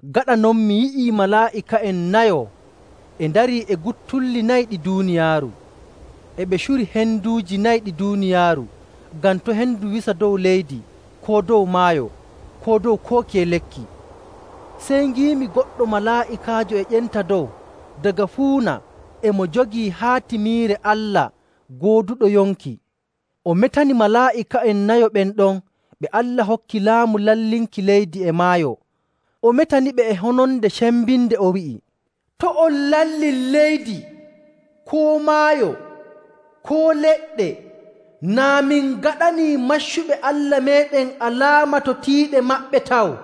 Gaɗa non mi yi'ii malaa'ika'en nayo e ndarii e guttulli nayi ɗi duuniyaaru. E ɓe curi henduuji nayi ɗi duuniyaaru ngam to' hendu wisa dow leydi koo dow maayo koo dow koo kiye lekki. Sey ngiimi goɗɗo malaa'ikaajo e ƴenta dow daga fuuna e mo jogii haatimiire Allah gooduɗo yonki. O metani malaa'ika'en nayo ɓen ɗon ɓe Allah hokki laamu lallinki leydi e maayo. O metaniɓe e hononde cembinde, o wi'i, “To' on lallin leydi koo maayo koo leɗɗe naa min ngaɗanii maccuɓe Allah meeɗen alaama to tiiɗe maɓɓe taw.”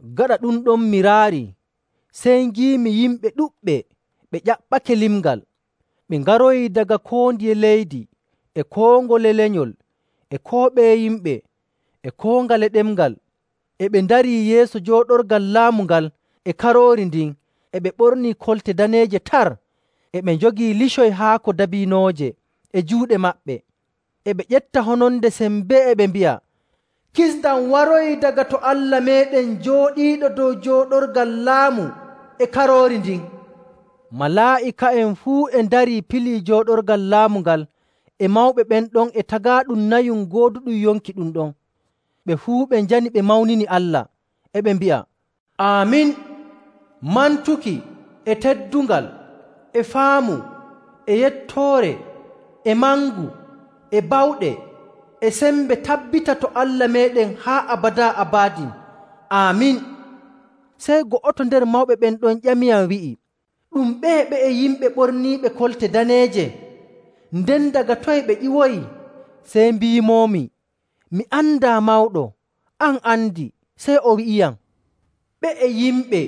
Gaɗa ɗum ɗon mi raarii sey ngiimi yimɓe ɗuɗɓe ɓe ƴaɓɓake limngal. Ɓe ngaroyii daga koo ndiye leydi, e koo ngole lenyol, e koo ɓeye yimɓe, e koo ngale ɗemngal, e ɓe ndarii yeeso jooɗorgal laamu ngal e Karoori ndin e ɓe ɓornii kolte daneeje tar. E ɓe njogii licoy haako dabiinooje e juuɗe maɓɓe. E ɓe ƴefta hononde sembee e ɓe mbi'a, “Kisndam waroyii daga to Allah meeɗen jooɗiiɗo dow jooɗorgal laamu e Karoori ndin!” Malaa'ika'en fuu e ndarii pilii jooɗorgal laamu ngal e mawɓe ɓen ɗon e tagaaɗum nayum gooduɗum yonki ɗum ɗon. Ɓe fuu ɓe njani ɓe mawnini Allah. E ɓe mbi'a, “Aamin! Mantuki, e teddungal, e faamu, e yettoore, e mangu, e bawɗe, e sembe tabbita to Allah meeɗen haa abadaa abadin! Aamin.” Sey go'oto nder mawɓe ɓen ɗon ƴamiyam wi'i, “Ɗum ɓeye ɓe'e yimɓe ɓorniiɓe kolte daneeje? Nden daga toye ɓe ƴiwoyi?” Sey mbiimoomi, “Mi andaa, mawɗo. An a andi.” Sey o wi'iyam, “Ɓe'e yimɓe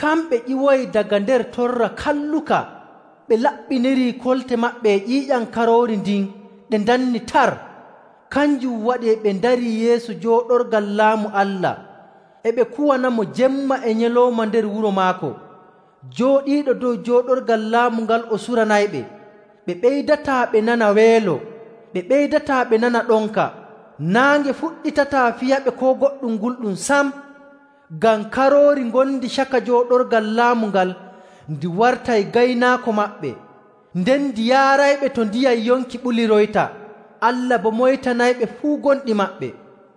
kamɓe ƴiwoyi daga nder torra kalluka. Ɓe laɓɓiniri kolte maɓɓe e ƴiiƴam Karoori ndin ɗe ndanni tar. Kanjum waɗi e ɓe ndarii yeeso jooɗorgal laamu Allah. E ɓe kuwanamo jemma e nyalawma nder wuro maako. Jooɗiiɗo dow jooɗorgal laamu ngal o suranayɓe. Ɓe ɓeydataa ɓe nana weelo, ɓe ɓeydataa ɓe nana ɗonka. Naange fuɗɗitataa piyaɓe koo goɗɗum gulɗum sam. Ngam Karoori ngondi caka jooɗorgal laamu ngal ndi wartay gaynaako maɓɓe. Nden ndi yaarayɓe to ndiyam yonki ɓuliroyta. Allah boo moytanayɓe fuu gonɗi maɓɓe.”